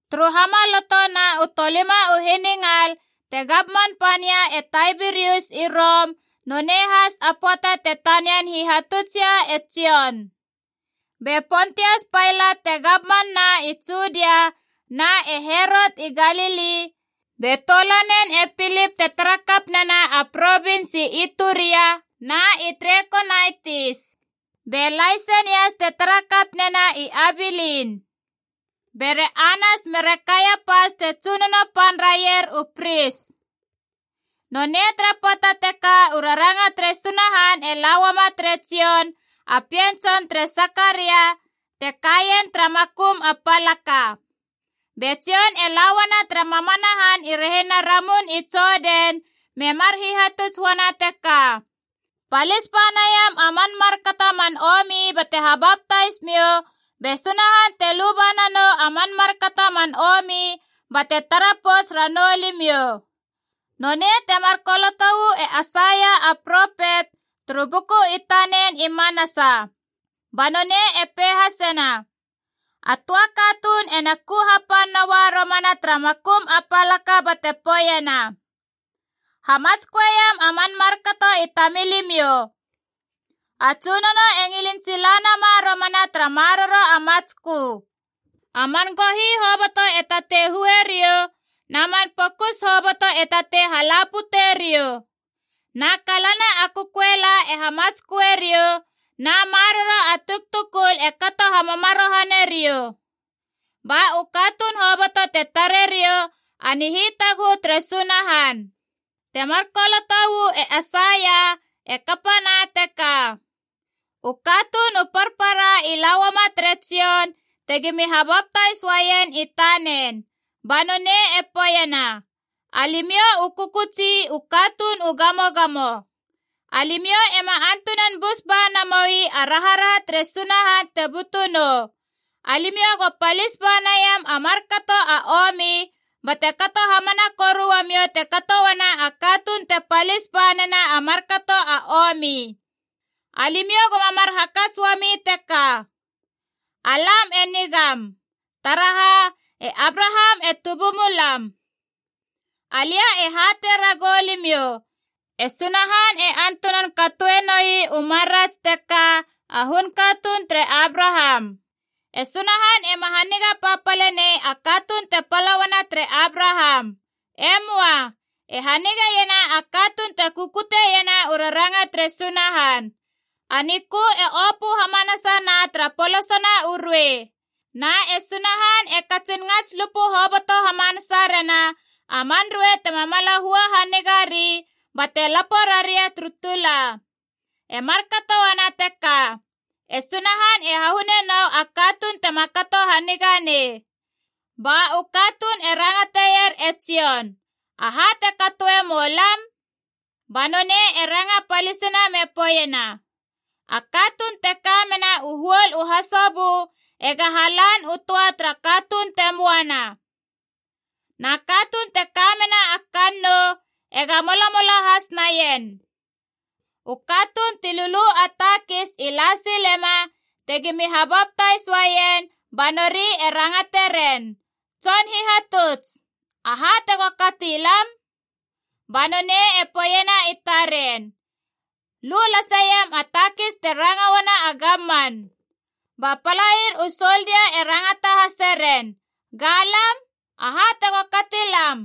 Turu hamaloto na u tolima u hiningal te gamman pania e Taibirius i Rom, nonei has a pöata te tanian hihatutsia e Jon. Be Pontias Pailat te gamman na i Judia, na e Herot i Galili, be toulanen e Pilip te tara kap nena a provins i Ituria na i Trekonaitis. Be Laisenias te tara kap nena i Abilin. Bere Anas mere Kaiapas te tsunono pan raier u pris. Nonei tara pöata teka u raranga tere Sunahan e la uama tere Jon, a pien tson tere Sakaria, te kaien tara makum a palaka. Be Jon e lauana tara mamana han i rehina Ramun i Jodan me mar hihatuts uana teka, “Palis ba naiam a man markato a man omi bate habaptais miou, be Sunahan te luba nanou a man markato a man omi bate tara pouts ranou limiou.” Nonei temar koloto uu e Aisaia a propet, turu buku i tanen i manasa. Ba nonei e pei hasena: “A töa katuun ena ku hapan noua romana tara makum a palaka bate poeiena, ‘Hamatsköeiam a man markato i tamilimiou. A Tsunono e ngilin sila nama romana tara maroro a matskö. A man gohi hoboto e tatei hue riou, na man pokus hoboto e tatei hala pute riou. Na kalana a kököela e hamatsköe riou, na maroro a tuktukul e kato hamamarohane riou. Ba u katuun hoboto te tare riou a nihitaguhu tere Sunahan!’” Temar koloto uu e Aisaia e kapana teka. U katuun u parpara i la uama tere Jon tegimi habaptais uaien i tanen. Ba nonei e poeiena, “Alimiou u kökötsi u katuun u gamogamo! Alimiou ema antunan bus ba namoi a raharaha tere Sunahan te butu nou! Alimiou go palis ba naiam a markato a omi, bate kato hamana koru uamou te kato uana a katuun te palis ba nena a markato a omi. Alimiou goma mar hakats uami teka: ‘Alam e nigam. Taraha? E Abraham e tubumulam.’ Alia e hatei ragou limiou, e Sunahan e antunan katoe noi u marats teka a hun katuun tere Abraham! E Sunahan ema haniga papale nei a katuun te pala uana tere Abraham. E möa. E hanigeiena a katuun te kukutiena u raranga tere Sunahan. A nikö e opö hamanasana tara polosona u ruei. Na e Sunahan e katsin ngats lupu hoboto hamanasa rena a man ruei tema mala hua haniga ri, bate lapo raria turu tula. E markato uana teka, e Sunahan e hahune nou a katuun tema kato haniga nei.” Ba u katuun e rangateier e Jon, “Aha te katoe mou lam?” Ba nonei e ranga palisina me poeiena, “A katuun te ka mena u huol u hasobö ega halan u töa tara katuun te möana. Na katuun te ka mena a kannou ega molamola has naien.” U katuun ti lulu a takis i la silema tegimi habaptais uaien, ba nori e rangate ren, “Tson hihatuts, aha tego kati lam?” Ba nonei e poeiena i taren, “Lu laseiam a takis te ranga uana a gamman.” Ba palair u soldia e rangata hase ren, “Ga lam, aha tego kati lam?”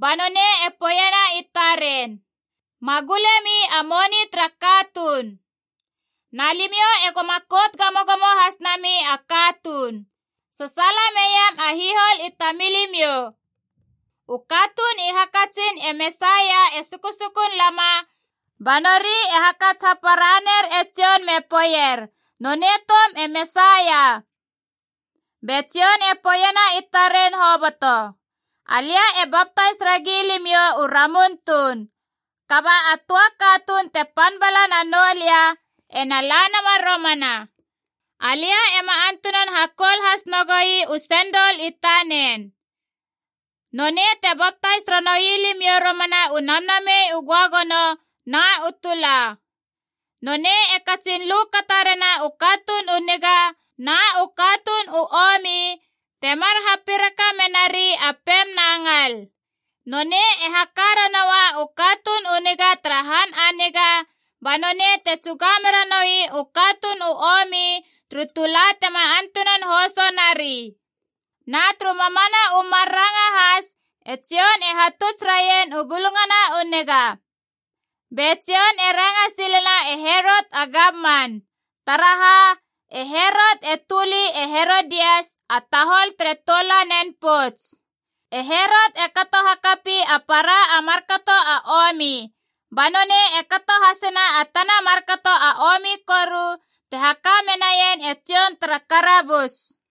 Ba nonei e poeiena i taren, “Ma gulemi a moni tara katuun. Na limiou egoma kout gamogamo has nami a katuun. Sasaala meiam a hihol i tamilimiou.” U katuun i hakatsin e Mesaia e sukusukun lama, ba nori e hakats hapara ner e Jon me poeier nonei toum e Mesaia. Be Jon e poeiena i taren hoboto, “Alia e baptais ragi limiou u ramun tuun, kaba a töa katuun te pan bala nanou lia ena la nama romana. Alia ema antunan hakoul has nagoi u sendol i tanen. Nonei te baptais ranoui limiou romana u Namnamei u Göagono na u tula. Nonei e katsin lu kata rena u katuun u niga na u katuun u omi, temar hapiraka menari a pem na ngal. Nonei e haka ranoua u katuun u niga tara han a niga, ba nonei te tsuga mera noui u katuun u omi turu tula tema antunan hoso nari.” Na turu mamana u mar ranga has e Jon e hatuts raien u Bulungana u Niga. Be Jon e ranga silena e Herot a gamman. Taraha? E Herot e töli e Herodias, a tahol tere toulanen pouts. E Herot e kato hakapi a para a markato a omi. Ba nonei e kato hasena a tana markato a omi koru te haka menaien e Jon tara karabus.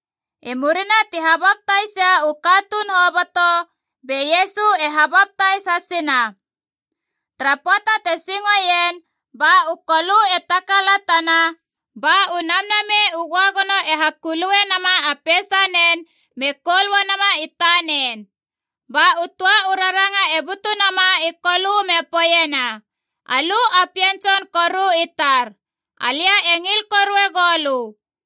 I murina ti habaptaisia u katuun hoboto, be Iesu e habaptais hasina. Tara pöata te singoien, ba u Kolö e takalatana, ba u Namnamei u Göagono e hakulue nama a peisanen me koul uanama i tanen. Ba u töa u raranga e butu nama i Kolö me poeiena, “Alö a Pien Tson koru i tar. Alia e ngil korue goulö.”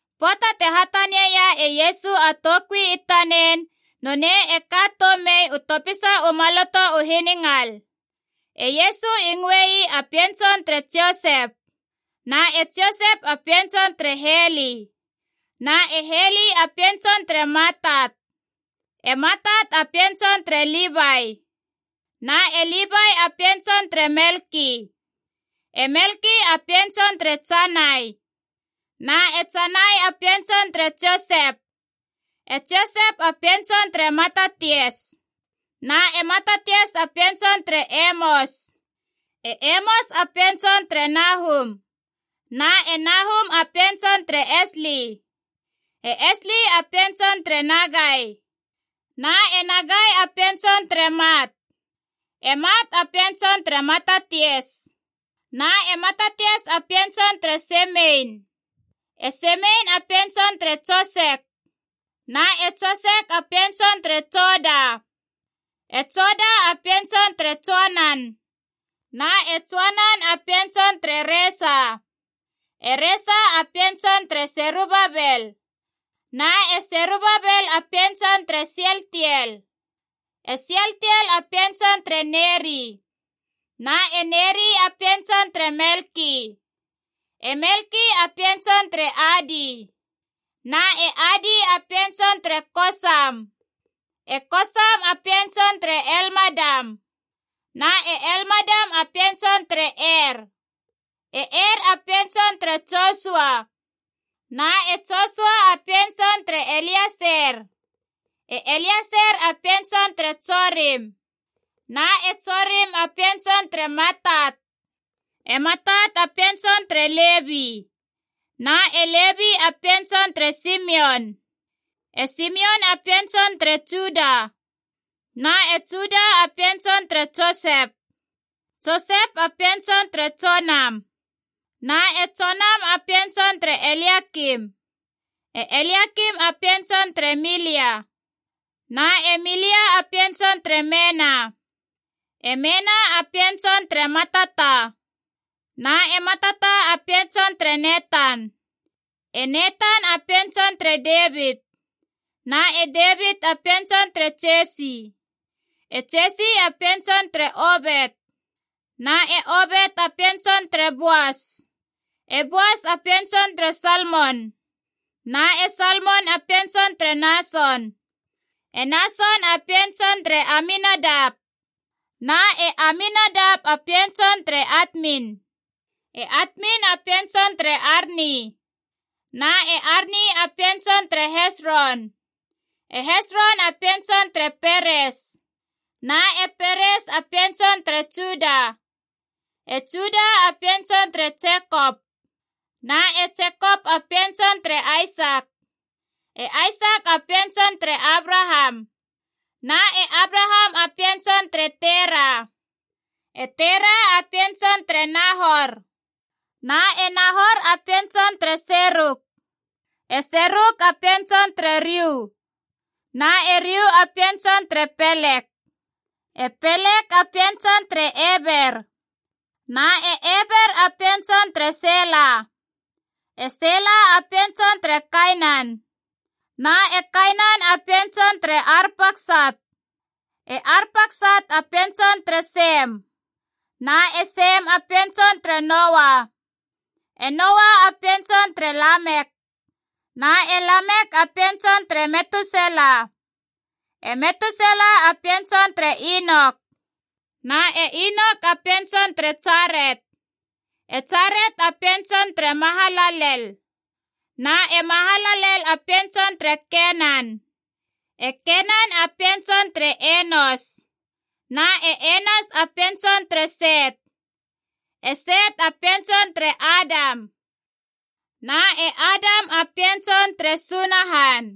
Pöata te hatanieia e Iesu a toukui i tanen, nonei e ka toum mei u topisa u maloto u hiningal. E Iesu i ngöe ii a pien tson tere Josep. Na e Josep a pien tson tere Heli. Na e Heli a pien tson tere Matat. E Matat a pien tson tere Livai. Na e Livai a pien tson tere Melki. E Melki a pien tson tere Janai. Na e Janai a pien tson tere Josep. E Josep a pien tson tere Matatias. Na e Matatias a pien tson tere Emos. E Emos a pien tson tere Nahum. Na e Nahum a pien tson tere Esli. E Esli a pien tson tere Nagai. Na e Nagai a pien tson tere Mat. E Mat a pien tson tere Matatias. Na e Matatias a pien tson tere Semein. E Semein a pien tson tere Josek. Na e Josek a pien tson tere Joda. E Joda a pien tson tere Joanan. Na e Joanan a pien tson tere Resa. E Resa a pien tson tere Serubabel. Na e Serubabel a pien tson tere Sialtiel. E Sialtiel a pien tson tere Neri. Na e Neri a pien tson tere Melki. E Melki a pien tson tere Adi. Na e Adi a pien tson tere Kosam. E Kosam a pien tson tere Elmadam. Na e Elmadam a pien tson tere Er. E Er a pien tson tere Josua. Na e Josua a pien tson tere Elieser. E Elieser a pien tson tere Jorim. Na e Jorim a pien tson tere Matat. E Matat a pien tson tere Levi. Na e Levi a pien tson tere Simion. E Simion a pien tson tere Juda. Na e Juda a pien tson tere Josep. Josep a pien tson tere Jonam. Na e Jonam a pien tson tere Eliakim. E Eliakim a pien tson tere Melia. Na e Melia a pien tson tere Mena. E Mena a pien tson tere Matata. Na e Matata a pien tson tere Netan. E Netan a pien tson tere Devit. Na e Devit a pien tson tere Jesi. E Jesi a pien tson tere Obet. Na e Obet a pien tson tere Boas. E Boas a pien tson tere Salmon Na e Salmon a pien tson tere Nason. E Nason a pien tson tere Aminadap. Na e Aminadap a pien tson tere Atmin. E Atmin a pien tson tere Arni. Na e Arni a pien tson tere Hesron. E Hesron a pien tson tere Peres. Na e Peres a pien tson tere Juda. E Juda a pien tson tere Jekop. Na e Jekop a pien tson tere Aisak. E Aisak a pien tson tere Abraham. Na e Abraham a pien tson tere Tera. E Tera a pien tson tere Nahor. Na e Nahor a pien tson tere Serug. E Serug a pien tson tere Riu. Na e Riu a pien tson tere Pelek. E Pelek a pien tson tere Eber. Na e Eber a pien tson tere Sela. E Sela a pien tson tere Kainan. Na e Kainan a pien tson tere Arpaksat. E Arpaksat a pien tson tere Sem. Na e Sem a pien tson tere Noa. E Noa a pien tson tere Lamek. Na e Lamek a pien tson tere Metusela. E Metusela a pien tson tere Inok. Na e Inok a pien tson tere Jaret. E Jaret a pien tson tere Mahalalel. Na e Mahalalel a pien tson tere Kenan. E Kenan a pien tson tere Enos. Na e Enos a pien tson tere Set. E Set a pien tson tere Adam. Na e Adam a pien tson tere Sunahan.